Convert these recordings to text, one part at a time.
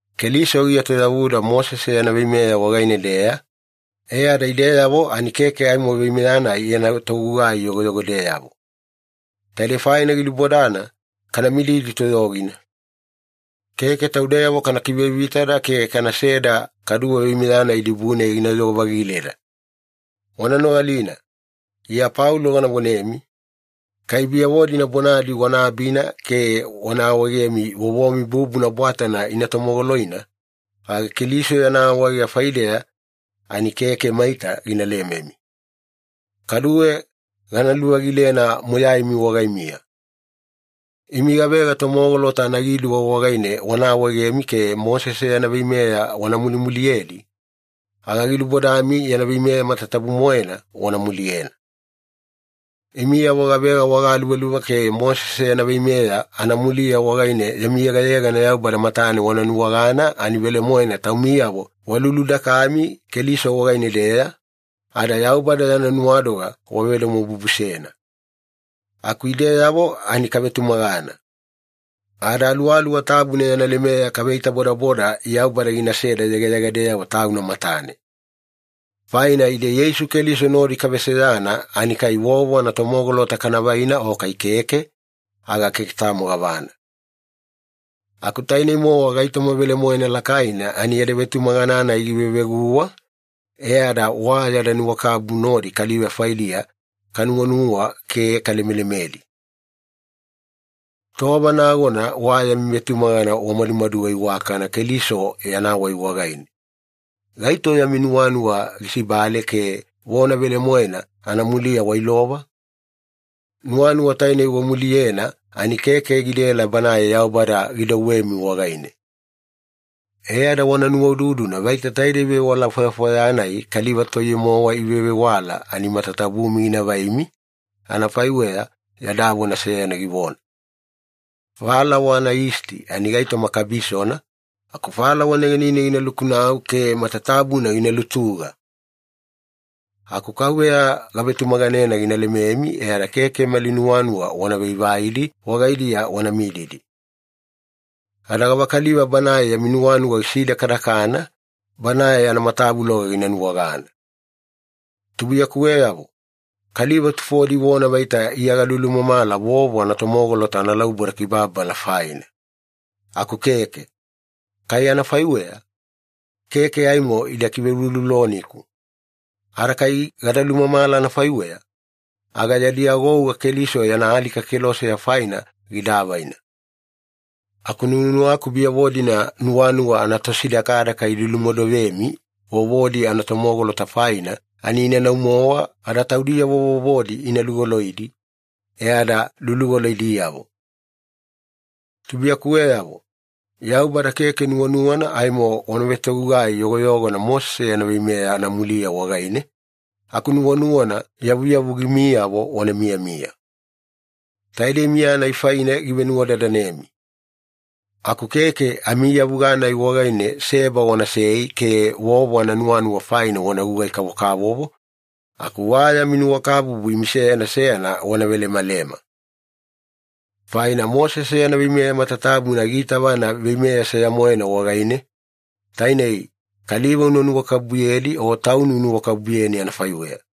Keliso gietoyavuda Mosese yana veimeya wagaine-deya, e ada ideyavo ani keke aimo veimeya-nai yana togugai yogoyogodeyavo. Taidei faina gilubodana kana mididi toyogina. Keke taudeyavo kana kivevitada ke kanaseda kaduwe veimeya-nai dibune ginayogo-vagileda. Wana nogalina. Iya Paulo gana vonemi, kai biyavo-dina bonadi wana abina ke wana awaegemi vovomi bubuna bwatana ina tomogoloina, aga Keliso yana awaega faideya ani keke maita gina lememi. Kaduwe gana luvagilena moyaimi wagaimiya. Imi gavega tomogolota anagiduwa wagaine wana awaegemi ke Mosese yana veimeya wana mulimuliyedi, aga gilubodami yana veimeya matatabu-moena wana muliyena. Imiyavo gavega wagaluvaluva ke Mosese yana veimeya anamuliya wagaine yami yegayegana Yaubada matane wana nuwagana ani velemoena taumiyavo waluludakami Keliso wagaine-deya, ada Yaubada yana nuwadoga wavedomobubusena. Aku ideyavo ani kavetumagana. Ada Aluwaluwa Tabuna yana lemeya kaveitabodaboda Yaubada ginaseda yegayegadeyavo Tauna matane. Faina ide Yeisu Keliso nodi kaveseyana ani kai vovo anatomogolota kavaina o kai keke, aga keke tamo gavana. Aku tainei-mowa gaitoma velemoena lakaina ani yada vetumagana-nai giveveguwa, e ada wa yada nuwakabubu nodi kaliva faidiya kanuwanuwa ke kalemelemedi. Tova nagona wa yami vetumagana wamadumaduga iwakana Keliso yana wai wagaine. Gaito yami nuwanuwa gisibale ke vona velemoena anamuliya wailova? Nuwanuwa tainei wamuliyena ani keke gidaela Banae Yaubada gidouwemi wagaine. E ada wana nuwaududuna vaita taide vewala fwayafwaya-nai kaliva toiye-mowa ivevewala ani matatabumi gina vaimi, anafaiweya yada vona seyana givona, “Falawa anayisti ani gaitoma kabisona, aku falawa negenine gina lukunau ke matatabuna gina lutuga.” Aku Kauveya gavetumaganena gina lememi e ada keke mali nuwanuwa wana vaivaidi wagaidiya wana mididi. Ada gavakaliva banae yami nuwanuwa gisidakadakana, banae anamatavuloga gina nuwagana. Tubuiyakuweyavo, kaliva tufodi ivona vaita Iya galumamala vovo anatomogolota analauboda kibababala faina. Aku keke. Kai anafaiweya, keke aimo ida kiveulouloloniku. Ada kai gada lumamala anafaiweya, aga yadi agouga Keliso yana alika keloseya faina gida avaina. Aku nuwanuwaku biyavo-dina nuwanuwa anatosidakadaka ilulumodovemi vovodi anatomogolota faina ani inanau-mowa ada taudiyavo vovodi ina lugoloidi, e ada lulugoloidiyavo! Tubuiyakuweyavo, Yaubada keke nuwanuwana aimo wana vetogugai yogoyogona Mosese yana veimeya anamuliya wagaine, aku nuwanuwana yavuyavugimiyavo wana miyamiya. Taidei miya-nai faine givenuwadadanemi. Aku keke amiiyavuga-nai wagaine seba wanasei ke vovo ananuwanuwa faina wana gugai-kavokavovo, aku wa yami nuwakabubu imi seyana seyana wana velemalema. Faina Mosese yana veimeya matatabuna giitavana veimeya seya-moena wagaine, tainei, “Kaliva una nuwakabubuyedi o tauni unuwakabubuyeni anafaiweya.”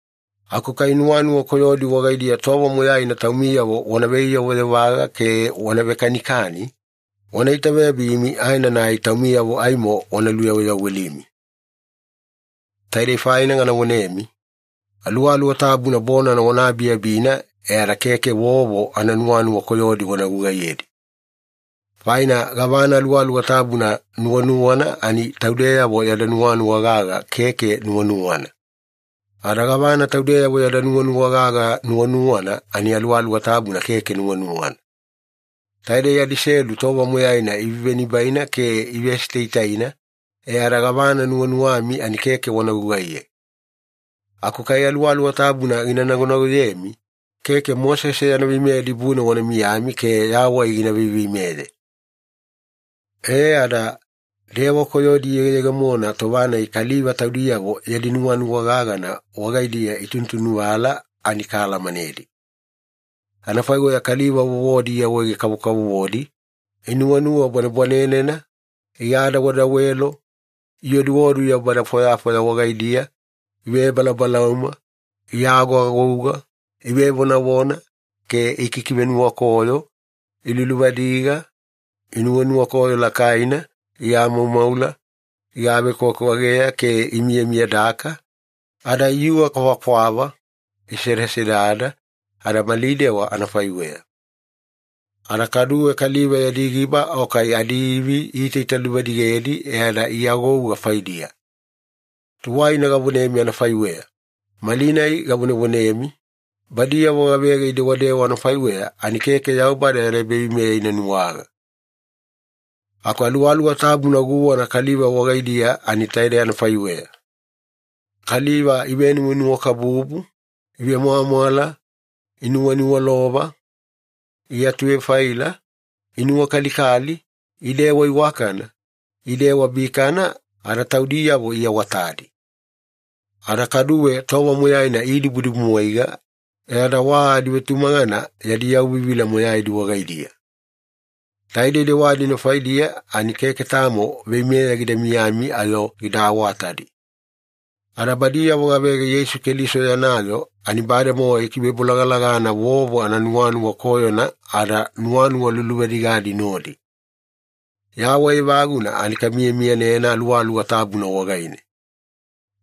Aku kai nuwanuwa koyodi wagaidiya tova moyaina taumiyavo wana veiyovayovaga ke wana vekanikani, wana itaveyabimi aenanai taumiyavo aimo wana luyaweyawelimi. Taidei faina gana vonemi, Aluwaluwa Tabuna bonana wana abiabina e ada keke vovo ananuwanuwa koyodi wana gugaiyedi. Faina gavana Aluwaluwa Tabuna nuwanuwana ani taudeyavo yada nuwanuwa gaga keke nuwanuwana. Ada gavana taudeyavo yada nuwanuwa gaga nuwanuwana ani Aluwaluwa Tabuna keke nuwanuwana. Taidei adiselu tova moyaina ivenibaina ke ivesitaitaina, e ada gavana nuwanuwami ani keke wana gugaiye. Aku kai Aluwaluwa Tabuna gina nagonagoyemi, keke Mosese yana veimeya dibune wana miyami ke yawai gina veiveimeye. E ada, dewa koyodi iyegeyegemona tova-nai kaliva taudiyavo yadi nuwanuwa gagana wagaidiya itunutunuvala ani kaalamanedi. Anafaiweya kaliva vovodi iawaawaege-kavokavovodi, inuwanuwa bwanebwanenena, igadawedawelo, ioduodu yaubada fwayafwaya wagaidiya, ivebalaubalauma, iagoagouga, ivevonavona ke ikikivenuwakoyo, iluluvadiga, inunuwakoyo lakaina, iamaumaula, igavekwavekwageya ke imiyamiyadaka, ada iyuga kwavakwava, isedasedada, ada mali dewa anafaiweya. Ada kaduwe kaliva yadi giba o kai adiivi iitaitaluvadigedi e ada iagouga faidiya. Tuwaina gavonemi anafaiweya, malinai gavonevonemi, badiyavo gavega idewadewa anafaiweya ani keke Yaubada yana ebaveimeya ina nuwaga. Aku Aluwaluwa Tabuna guwana kaliva wagaidiya ani taidei anafaiweya. Kaliva ivenuwanuwakabubu, ivemwamwala, inuwaniwalova, iatuvefaila, inuwakalikali, idewadewa iwakana, idewadewa bikana, ada taudiyavo iawaawatadi. Ada kaduwe tova moyaina idibudibumwaiga e ada wa adivetumagana yadi yauvivila moyaidi wagaidiya. Taidei dewa-dina faidiya ani keke tamo veimeya gida miyami ayo gida awatadi. Ada badiyavo gavega Yeisu Keliso yana yoo ani bademowa ikivebolagalagana vovo ananuwanuwa koyona ada nuwanuwa luluvadigadi nodi. Yawai evaguna ani kamiyamiyanena Aluwaluwa Tabuna wagaine.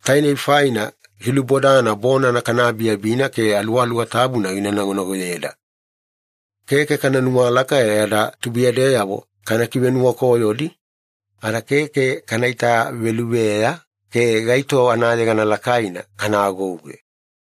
Tainei faina gilubodana bonana kana abiabina ke Aluwaluwa Tabuna gina nagonagoyeda. Keke kana nuwalaka e ada tubuiyadeyavo kana kivenuwakoyodi, ada keke kana veitaveluveya ke gaito anayegana lakaina kana agouge.